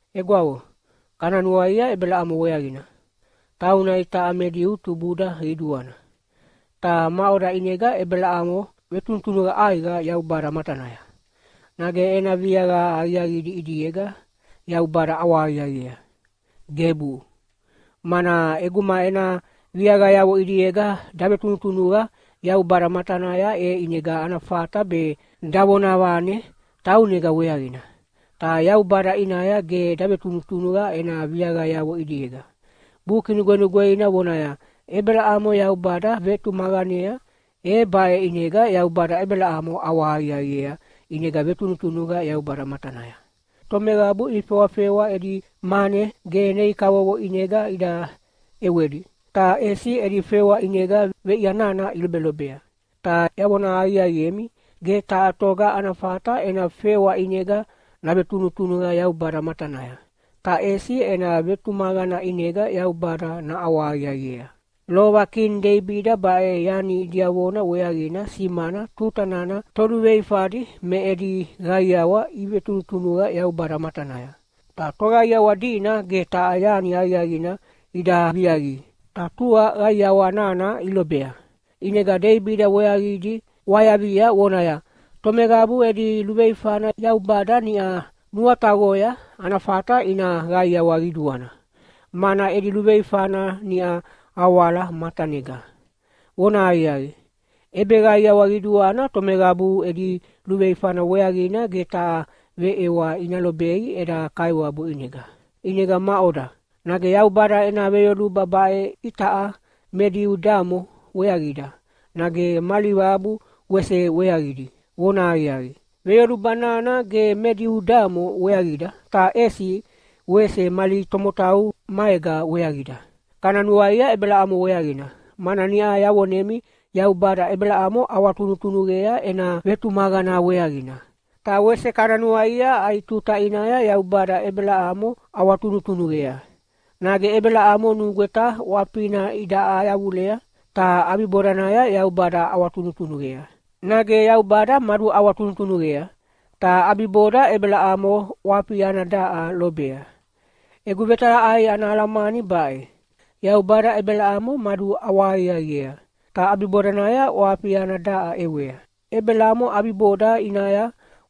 Egwavo, kana nuaia Ebelamo weaqina, tauna itaʼa me Diu tubuda qiduana. Ta maʼoda ʼinega Ebelamo vetunutunuqa ʼaiqa Yaubada matanaya? Nage ena viaqa aqiaqidi ʼidiega Yaubada ʼawahaqiaqiea? Gebu! Mana ʼeguma ena viaqayavo ʼidiega davetunutunuqa Yaubada matanaya, e ʼinega ana fata be davonavane taunega weaqina. Ta Yaubada ʼinaya ge davetunutunuqa ena viaqayavo ʼidiega. Buki Nugwenugweina vonaya, “Ebelamo Yaubada vetumaqanea, e baʼe ʼinega Yaubada Ebelamo ʼawahaqiaqiea ʼinega vetunutunuqa matanaya.” Tomeqabu ifewafewa edi mane ge nei kavovo ʼinega ida ʼewedi, ta ʼesi edi fewa ʼinega veʼia nana ilobelobea. Ta yavona aqiaqiemi, ge taha toga ana fata ena fewa ʼinega navetunutunuqa Yaubada matanaya, ta ʼesi ena vetumaqana ʼinega Yaubada naʼawahaqiaqiea. Lova kini Deibida baʼe yani diavona weaqina simana tuta nana toluveifadi me edi qaiawa ivetunutunuqa Yaubada matanaya, ta toqaiawa dina ge taha yani aqiaqina ida viaqi, ta tua qaiawa nana ilobea, ʼinega Deibida weaqidi ʼwayavia vonaya, “Tomeqabu edi luveifana Yaubada niʼa nuataqoya, ana fata ina qaiawa qiduana, mana edi luveifana niʼa awala matanega. Vonahaqiaqi, ʼebeqaiawa qiduana tomeqabu edi luveifana weaqina ge taha veʼewa ina lobei eda Kaiwabu ʼinega.” ʼInega maʼoda, nage Yaubada ena veyoluba baʼe itaʼa me Diu damo weaqida, nage mali qabu wese weaqidi? Vonahaqiaqi, veyoluba nana ge me Diu damo weaqida, ta ʼesi wese mali tomotau maega weaqida. Kana nuaia Ebelamo weaqina, mana niʼa yavonemi Yaubada Ebelamo ʼawatunutunuqea ena vetumaqana weaqina. Ta wese kana nuaia ai tuta ʼinaya Yaubada Ebelamo ʼawatunutunuqea. Nage Ebelamo nugweta ʼwafina idaʼa yavulea, ta ʼabibodanaya Yaubada ʼawatunutunuqea, nage Yaubada maduʼawatunutunuqea, ta ʼabiboda Ebelamo ʼwafi ana daʼa lobea? Egu vetalaʼai ana alamani baʼe: Yaubada Ebelamo maduʼawahaqiaqiea, ta ʼabibodanaya ʼwafi ana daʼa ʼewea. Ebelamo ʼabiboda ʼinaya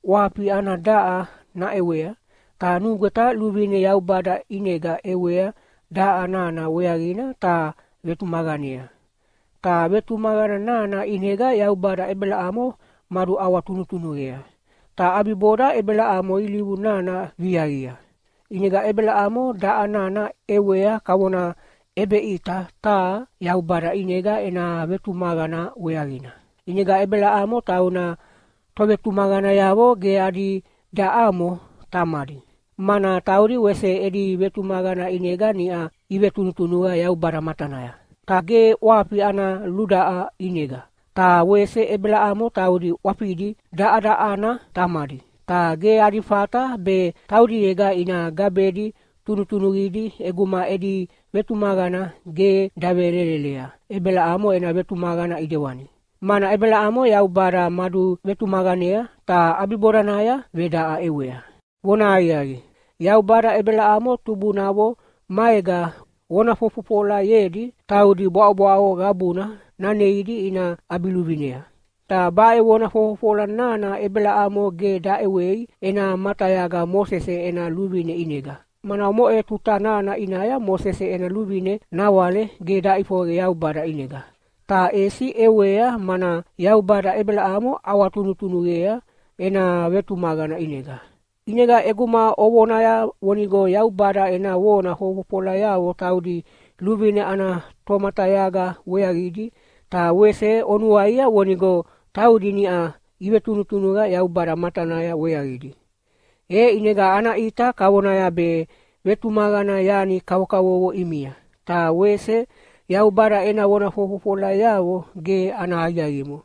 ʼwafi ana daʼa naʼewea, ta nugweta luvine Yaubada ʼinega ʼewea daʼa nana weaqina ta vetumaqanea. Ta vetumaqana nana ʼinega Yaubada Ebelamo maduʼawatunutunuqea, ta ʼabiboda Ebelamo ilivu nana viaqia. ʼInega Ebelamo daʼa nana ʼewea kavona ʼebeʼita taha Yaubada ʼinega ena vetumaqana weaqina. ʼInega Ebelamo tauna tovetumaqanayavo ge adi daʼamo tamadi. Mana taudi wese edi vetumaqana ʼinega niʼa ivetunutunuqa Yaubada matanaya, ta ge ʼwafi ana ludaʼa ʼinega. Ta wese Ebelamo taudi ʼwafidi daʼadaʼana tamadi. Ta ge adi fata be taudiega ina gabedi tunutunuqidi ʼeguma edi vetumaqana ge davelelelea Ebelamo ena vetumaqana ʼidewani, mana Ebelamo Yaubada maduvetumaqanea ta ʼabibodanaya vedaʼa ʼewea. Vonahaqiaqi, Yaubada Ebelamo tubunavo maega vona fofofolayedi taudi bwaʼobwaʼo qabuna naneidi ina ʼabiluvinea. Ta baʼe vona fofofola nana Ebelamo ge daʼewei ena matayaga Mosese ena luvine ʼinega, mana omoʼe tuta nana ʼinaya Mosese ena luvine nawale ge daʼifoqe Yaubada ʼinega, ta ʼesi ʼewea mana Yaubada Ebelamo ʼawatunutunuqea ena vetumaqana ʼinega. ʼInega ʼeguma ovonaya vonigo Yaubada ena vona fofofolayavo taudi luvine ana tomatayaga weaqidi, ta wese onuaia vonigo taudi niʼa ivetunutunuqa Yaubada matanaya weaqidi. E ʼinega ana ʼita kavonaya be vetumaqana yani kavokavovo ʼimia, ta wese Yaubada ena vona fofofolayavo ge ana aqiaqimo.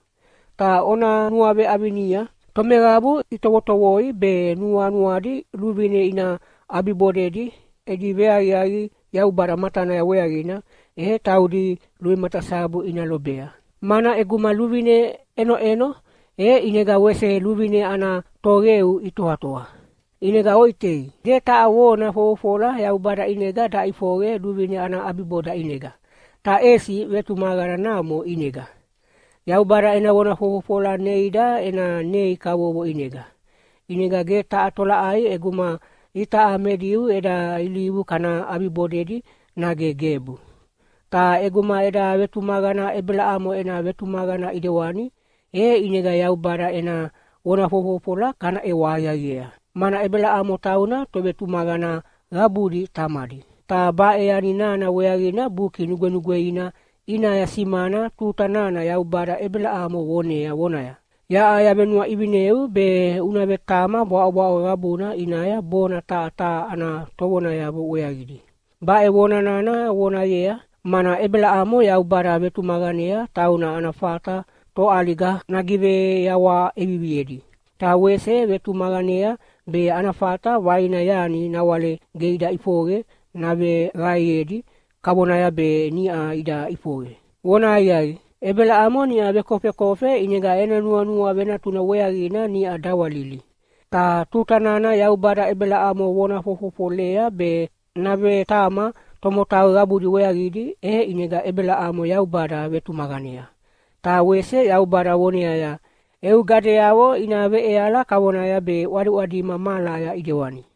Ta ona nuaveʼavinia, tomeqabu itovotovoi be nuanuadi luvine ina ʼabibodedi edi veaqiaqi Yaubada matanaya weaqina, e taudi luvematasabu ina lobea. Mana ʼeguma luvine ʼenoʼeno, e ʼinega wese luvine ana toqeu itoatoa. ʼInega oʼitei, ge taha vona fofofola Yaubada ʼinega daʼifoqe luvine ana ʼabiboda ʼinega, ta ʼesi vetumaqana namo ʼinega. Yaubada ena vona fofofola neida ena nei kavovo ʼinega. ʼInega ge taha tolaʼai ʼeguma itaʼa me Diu eda ilivu kana ʼabibodedi nage gebu. Ta ʼeguma eda vetumaqana Ebelamo ena vetumaqana ʼidewani, e ʼinega Yaubada ena vona fofofola kana ʼewa aqiaqiea. Mana Ebelamo tauna tovetumaqana qabudi tamadi. Ta baʼe yani nana weaqina Buki Nugwenugweina ʼinaya simana tuta nana Yaubada Ebelamo vonea vonaya, “Yaʼa yavenuaʼivineu be una vetama bwaʼobwaʼo qabuna ʼinaya bona taha taha ana tovonayavo weaqidi.” Baʼe vona nana vonayea, mana Ebelamo Yaubada vetumaqanea tauna ana fata toʼaliga nagiveyawaha ʼeviviedi, ta wese vetumaqanea be ana fata vaina yani nawale ge ida ʼifoqe naveqaeyedi kavonaya be niʼa ida ʼifoqe. Vonahaqiaqi, Ebelamo niʼa vekofekofe ʼinega ena nuanua venatuna weaqina niʼa dawalili. Ta tuta nana Yaubada Ebelamo vona fofofolea be navetama tomotau qabudi weaqidi, e ʼinega Ebelamo Yaubada vetumaqanea. Ta wese Yaubada voneaya, “Eu gadeyavo ina veʼeala kavonaya be ʼwadiʼwadima mahalaya ʼidewani.”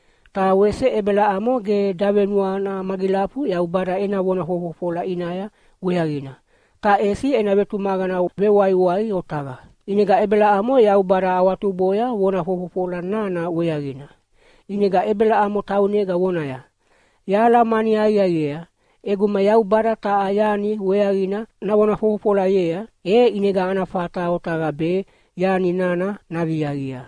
Ta wese Ebelamo ge davenuana magilafu Yaubada ena vona fofofola ʼinaya weaqina, ta ʼesi ena vetumaqana vewaiwai otaqa. ʼInega Ebelamo Yaubada awatuboya vona fofofola nana weaqina. ʼInega Ebelamo taunega vonaya, “Yahalamani aqiaqiea, ʼeguma Yaubada taha yani weaqina navona fofofolayea, e ʼinega ana fata otaqa be yani nana naviaqia.”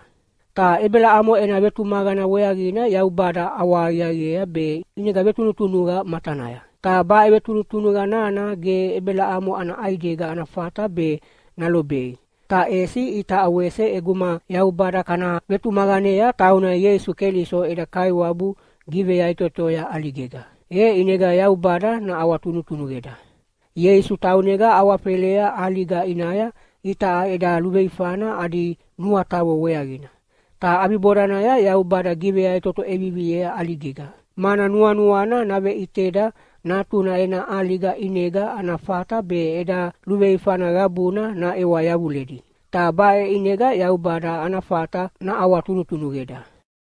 Ta Ebelamo ena vetumaqana weaqina Yaubada ʼawahaqiaqiea be ʼinega vetunutunuqa matanaya. Ta baʼe vetunutunuqa nana ge Ebelamo ana ʼaidega ana fata be nalobei, ta ʼesi itaʼa wese ʼeguma Yaubada kana vetumaqanea tauna Ieisu Keliso eda Kaiwabu giveyaʼitotoya ʼaligega, e ʼinega Yaubada naʼawatunutunuqeda. Ieisu taunega awafelea ʼaliga ʼinaya itaʼa eda luveifana adi nuataqo weaqina, ta ʼabibodanaya Yaubada giveyaʼitoto ʼeviviea ʼaligega, mana nuanuana naveʼiteda Natuna ena ʼaliga ʼinega ana fata be eda luveifana qabuna naʼewa yavuledi. Ta baʼe ʼinega Yaubada ana fata naʼawatunutunuqeda.